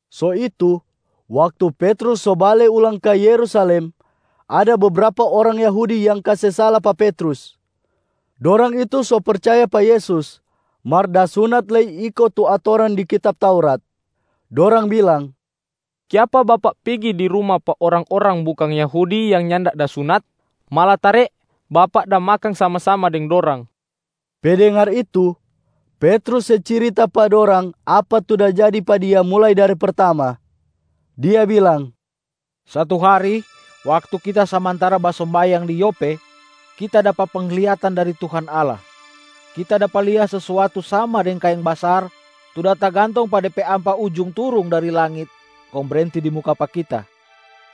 So itu, waktu Petrus so bale ulang ka Yerusalem, ada bebrapa orang Yahudi yang kase sala pa Petrus. Dorang itu so percaya pa Yesus mar da sunata lei iko tu atoran di kitab Taurat. Dorang bilang, “Kiapa bapak pigi di ruma pa orang-orang bukang Yahudi yang nyanda da sunat? Malatare bapak da makang sama-sama deng dorang!” Pe dengar itu, Petrus se cirita pa dorang apa tu da jadi pa dia mulai dari pertama. Dia bilang, “Satu hari waktu kita samantara basombayang di Yope, kita dapa penglihatan dari Tuhan Allah. Kita dapa lia sesuatu sama deng kaeng basar tu da tagantong pa de pe ampa ujung turung dari langit kong brenti di muka pa kita.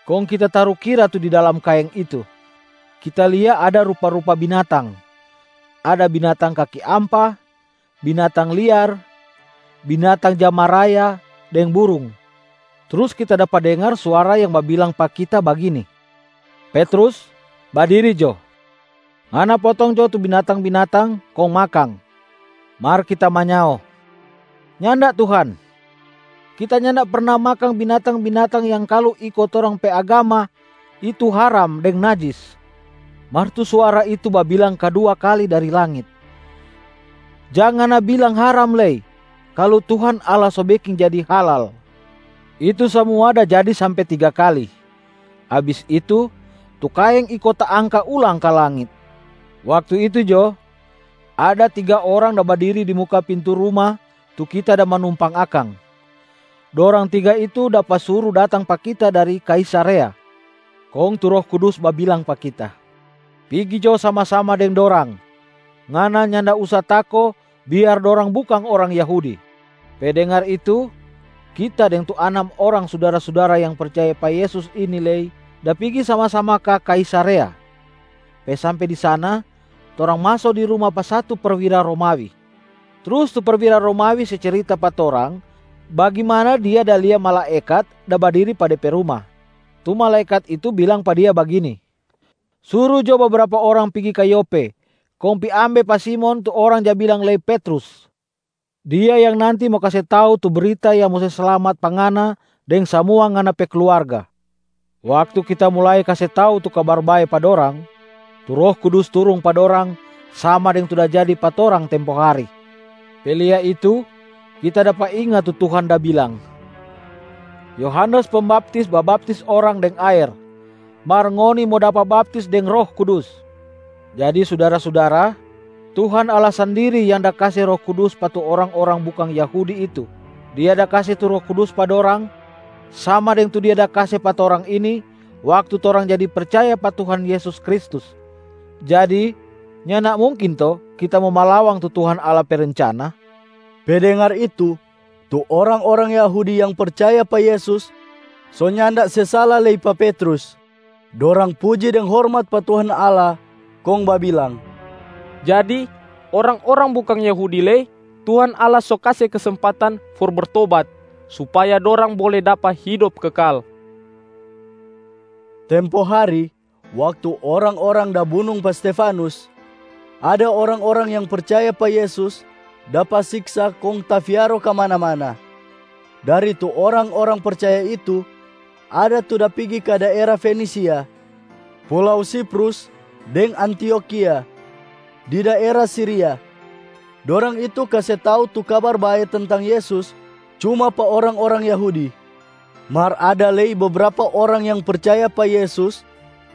Kong kita tarukira tu di dalam kaeng itu, kita lia ada rupa-rupa binatang: ada binatang kaki ampa, binatang liar, binatang ja maraya deng burung. Trus kita dapa dengar suara yang babilang pa kita bagini, ‘Petrus, badiri jo. Ngana potong jo tu binatang-binatang kong makang.’ Mar kita manyao, ‘Nyanda Tuhan. Kita nyanda perna makang binatang-binatang yang kalu iko torang pe agama itu haram deng najis.’ Mar tu suara itu babilang kadua kali dari langit, ‘Jang ngana bilang haram lei kalu Tuhan Allah so beking jadi halal.’ Itu samua da jadi sampe tiga kali. Abis itu, tu kaeng iko taangka ulang ka langit. Waktu itu jo, ada tiga orang da badiri di muka pintu ruma tu kita da manumpang akang. Dorang tiga itu dapa suru datang pa kita dari Kaisarea. Kong tu Roh Kudus babilang pa kita, ‘Pigi jo sama-sama deng dorang. Ngana nyanda usa tako biar dorang bukang orang Yahudi.’ Pe dengar itu, kita deng tu anam orang sudara-sudara yang percaya pa Yesus ini lei da pigi sama-sama ka Kaisarea. Pe sampe di sana, torang maso di ruma pa satu perwira Romawi. Trus tu perwira Romawi se cirita pa torang bagimana dia da lia malaekat da badiri pa de pe ruma. Tu malaekat itu bilang pa dia bagini, ‘Suru jo bebrapa orang pigi ka Yope, kong pi ambe pa Simon tu orang ja bilang lei Petrus. Dia yang nanti mo kase tau tu brita yang mo se slamat pa ngana deng samua ngana pe kluarga.’ Waktu kita mulai kase tau tu Kabar Bae pa dorang, tu Roh Kudus turung pa dorang sama deng tu da jadi pa torang tempo hari. Pe lia itu, kita dapa inga tu Tuhan da bilang, ‘Yohanes Pembaptis babaptis orang deng aer, mar ngoni mo dapa baptis deng Roh Kudus.’ Jadi sudara-sudara, Tuhan Allah sandiri yang da kase Roh Kudus pa tu orang-orang bukang Yahudi itu. Dia da kase tu Roh Kudus pa dorang sama deng tu Dia da kase pa torang ini waktu torang jadi percaya pa Tuhan Yesus Kristus. Jadi, nyanda mungkin to kita mo malawang tu Tuhan Allah pe rencana?” Pe dengar itu, tu orang-orang Yahudi yang percaya pa Yesus so nyanda se sala lei pa Petrus. Dorang puji deng hormat pa Tuhan Allah kong babilang, “Jadi, orang-orang bukang Yahudi lei Tuhan Allah so kase kesempatan for bertobat supaya dorang bole dapa hidop kekal.” Tempo hari, waktu orang-orang da bunung pa Stefanus, ada orang-orang yang percaya pa Yesus dapa siksa kong tafiaro kamana-kamana. Dari tu orang-orang percaya itu, ada tu da pigi ka daera Fenisia, pulau Siprus deng Antiokhia di daera Siria. Dorang itu kase tau tu Kabar Bae tentang Yesus cuma pa orang-orang Yahudi. Mar ada lei bebrapa orang yang percaya pa Yesus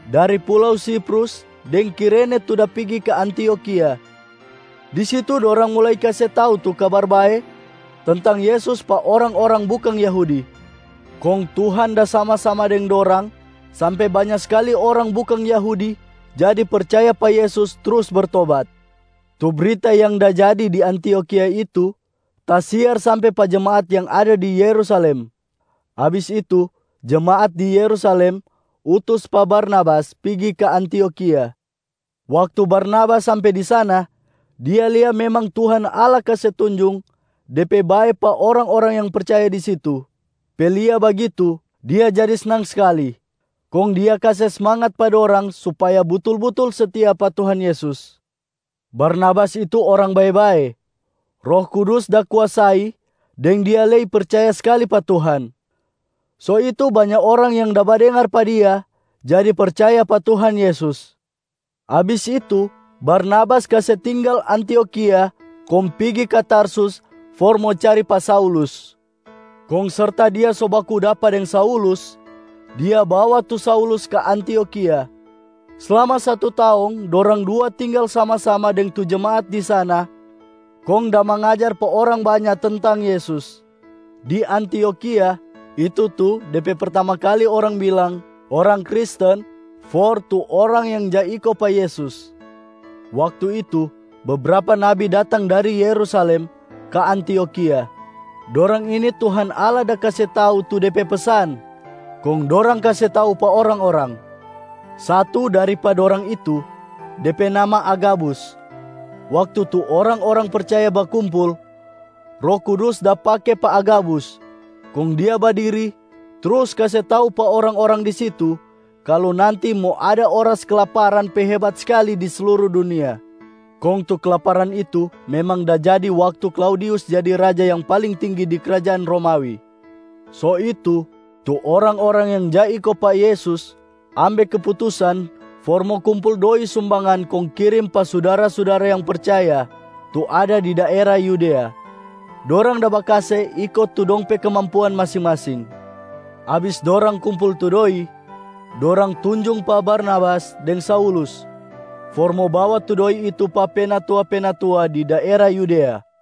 dari pulau Siprus deng Kirene tu da pigi ka Antiokhia. Di situ dorang mulai kase tau tu Kabar Bae tentang Yesus pa orang-orang bukang Yahudi. Kong Tuhan da sama-sama deng dorang sampe banya skali orang bukang Yahudi jadi percaya pa Yesus trus bertobat. Tu brita yang da jadi di Antiokhia itu tasiar sampe pa jemaat yang ada di Yerusalem. Abis itu, jemaat di Yerusalem utus pa Barnabas pigi ka Antiokhia. Waktu Barnabas sampe di sana, dia lia memang Tuhan Allah kase tunjung De pe bae pa orang-orang yang percaya di situ. Pe lia bagitu, dia jadi snang skali, kong dia kase smangat pa dorang supaya butul-butul setia pa Tuhan Yesus. Barnabas itu orang bae-bae, Roh Kudus da kuasai deng dia lei percaya skali pa Tuhan. So itu, banya orang yang da badengar pa dia jadi percaya pa Tuhan Yesus. Abis itu Barnabas kase tinggal Antiokhia kong pigi ka Tarsus for mo cari pa Saulus. Kong serta dia so baku dapa deng Saulus, dia bawa tu Saulus ka Antiokhia. Slama satu taong, dorang dua tinggal sama-sama deng tu jemaat di sana kong da mangajar pa orang banya tentang Yesus. Di Antiokhia, itu tu de pe pertama kali orang bilang ‘orang Kristen’ for tu orang yang ja iko pa Yesus. Waktu itu, bebrapa nabi datang dari Yerusalem ka Antiokhia. Dorang ini Tuhan Allah da kase tau tu De pe pesan kong dorang kase tau pa orang-orang. Satu dari pa dorang itu, de pe nama Agabus. Waktu tu orang-orang percaya bakumpul, Roh Kudus da pake pa Agabus kong dia badiri trus kase tau pa orang-orang di situ kalu nanti mo ada oras kelaparan pe hebat skali di sluru dunia. (Kong tu kelaparan itu memang da jadi waktu Klaudius jadi raja yang paling tinggi di krajaan Romawi.) So itu, tu orang-orang yang ja iko pa Yesus ambe keputusan for mo kumpul doi sumbangan kong kirim pa sudara-sudara yang percaya tu ada di daera Yudea. Dorang da bakase iko tu dong pe kemampuan masing-masing. Abis dorang kumpul tu doi, dorang tunjung pa Barnabas deng Saulus for mo bawa tu doi itu pa penatua-penatua di daera Yudea.